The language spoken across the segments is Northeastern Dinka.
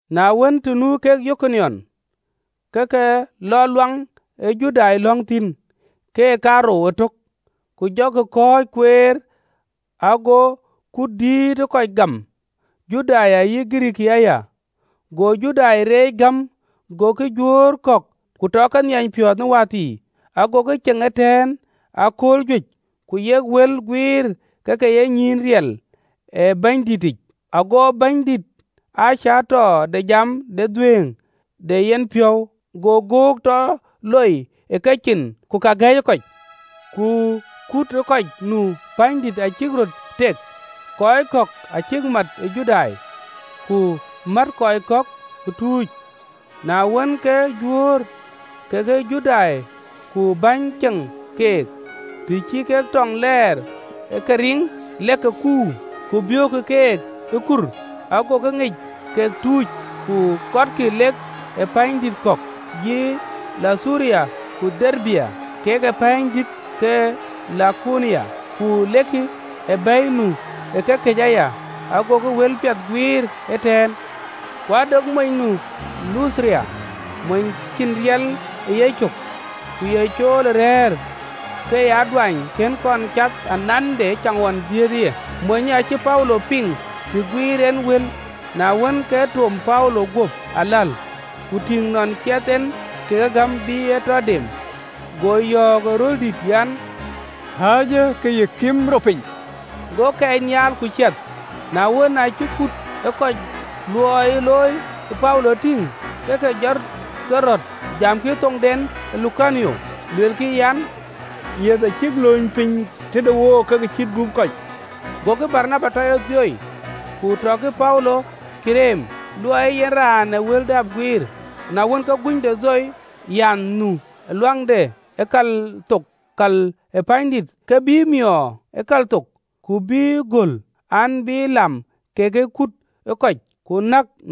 Na wën, të nu kek Yikoniom, ke ke lɔ luaŋ ee Judai lɔ̈ŋ thïn, keek kaarou ëtök, ku jɔkï kɔc guiëër, ago kut dïït ë kɔc gam, Judai ayï Girikii aya. Go Judai reec gäm gokï Juöör kɛ̈ɛ̈k, ku tɔkï ke nhiany piɔ̈ɔ̈th në wäthii. Agokï ceŋ ëtɛ̈ɛ̈n ë akööl juëc ku yek wël guiir ke ke ye nyïïn riɛl ë Bɛ̈nydïtic, ago Bɛ̈nydït aa cäätɔ de jam de dhuëëŋ de yenpiɔ̈u, go göök tɔ loi ë kecin, ku ka gɛ̈iyë kɔc. Ku kut ë kɔc nu pänydït acïk röt tek, kɔc kɔ̈k acïk mat ë Judai, ku mät kɔc kɔ̈k ë tuuc. Na wën, ke Juöör kekë Judai ku bäny ceŋ keek, të cï kek tɔŋ lɛɛr ë ke riŋ, lek ke kuur, ku biöökë keek ë kur. Agokï ŋic kek tuuc, ku kɔtkï, lek ë pɛ̈ɛ̈nydït kɔ̈k, yï Luthura ku Derbe, kek pɛ̈ɛ̈nydït ke Lukonia, ku lekï ë bɛ̈i nu ë kekëc aya. Agokï wëlpiɛth guiir ëtɛ̈ɛ̈n. Ku ade mony nu Luthura, mony cïn riɛl ë yecök, ku ye cool ë rɛ̈ɛ̈r, ke ye aduany kën kɔn cath anande ëcaŋɣɔn dhiëëthë ye. Monyë acï Paulo piŋ të guïïr en wël. Na wën, ke toom Paulo guöp aläl, ku tïŋ nɔn ciɛth en ke gäm bï e tɔ dem, go yɔ̈ɔ̈k ë röl dït an, “Kääcë ke yï kim rɔt piny!” Go kɛɛc nhial ku ciɛth. Na wën, aacï kut ë kɔc luɔi ë looi Paulo tïŋ, ke ke jɔt keröt, jamkï në thoŋdɛn ë Lukaonia, luelkï an, “Yiëth acïk lööny piny tëde wook ke ke cït gup kɔc!” Gokï Baranaba tɔ ye Dhio, ku tɔkï Paulo ye Ɣereme, luɔi ee yen raan ee wël dap guiir. Na wën, ke guny de Dhio, raan nu ë luaŋde ë kal thok kal ë pänydït, ke bïï miöör gööl ë kal thok an, bïï bɛ̈n lam kekë kut ë kɔc, ku nɛ̈kkï keek tuuc.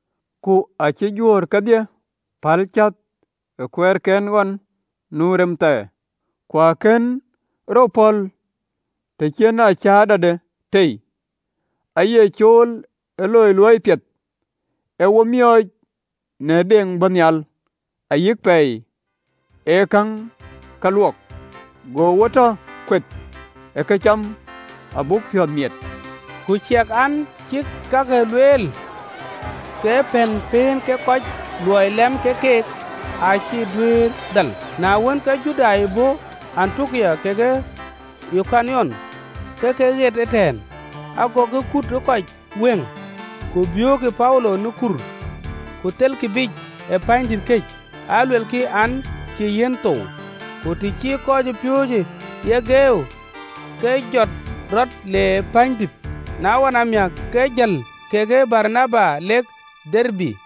Ku acï juöör kedhie päl cäth ë kuɛɛrken ɣɔn nu rɛm thɛɛr. Ku akën rɔt pɔ̈l të cïn cäätɔde tei, aaye cool ë loi luɔi piɛth, ee wo miɔɔc në deŋ bɔ̈ nhial ayï pɛɛi ee käŋ luɔk, go wo tɔ kueth ë këcam abuk piɔ̈ɔ̈th miɛt.” Ku ciɛk an, cïk kake lueel, ke pɛ̈n pën kek kɔc luɔi lam kek keek, acï dhal. Na wën, ke Judai bɔ̈ ë Antiokia kekë Yikoniom ke ke ɣet ëtɛ̈ɛ̈n: agokï kut ë kɔc wëŋ, ku biöökkï Paulo në kur, ku thelkï biic ë pänydït këc, aluelkï, an, cï yiɛ̈n thou. Ku të cï kɔcpiööcë ye geeu, ke jɔt rɔt le pänydït, na ɣɔn amiäk, ke jël kekë Baranaba lek Derbe.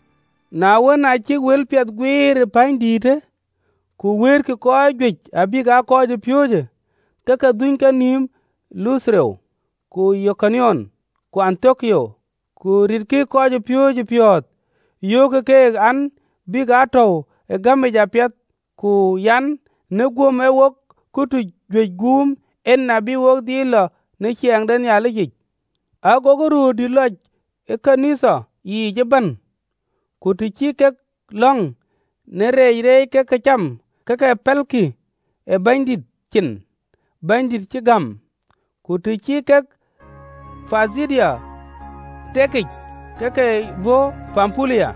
Na wën, aa cïk wëlpiɛth guiëër pänydïïtë, ku wëëtkï kɔc juëc abïk aa kɔcpiööcë, ke ke dhuny kenïïm Luthura, ku Yikoniom, ku Antiokia në Pithidia. Ku ritkï kɔcpiööcë piɔ̈ɔ̈th, yöökkï keek an, “Bïk aa tɔ̈u ë gämic apiɛth, ku an, në guöm ee wok katuc juëc guum en abï wo dhil lɔ ë ciɛɛŋ de Nhialicic.” Agokï röördït lɔc ë ɣööt ke Nhialic yiic ëbɛ̈n, ku të cï kek lɔ̈ŋ në rɛɛc reec kek cäm, ke ke pɛ̈lkï ë Bɛ̈nydït cin, Bɛ̈nydïït cïk gam. Ku të cï kek Pithidia reetic, ke ke bɔ̈ Pampulia.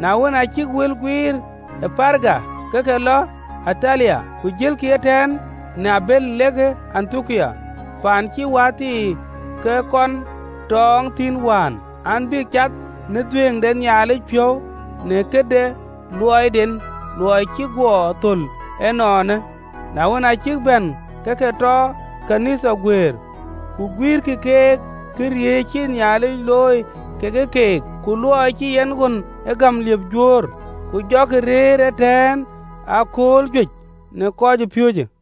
Na wën, aa cïk wël guiir ë Perga, ke ke lɔ Atalia, ku jëlkï ëtɛ̈ɛ̈n në abël lek Antiokia, paan cï wäthii ke kɔn tɔ̈ɔ̈ŋ thïn wään an, bïk cath në dhuëëŋ de Nhialic piɔ̈u në këde luɔiden, luɔi cïk guɔ thöl ënɔɔnë. Na wën, aa cïk bɛ̈n, ke ke tɔ kɔc ke ɣön ë Nhialic tɔ guëër, ku guïïrkï keek këriëëc cïï Nhialic looi kekë keek, ku luɔi cï en ɣön ë gäm liëp Juöör. Ku jɔkï rëër ëtɛ̈ɛ̈n ë akööl juëc në kɔcpiööcë.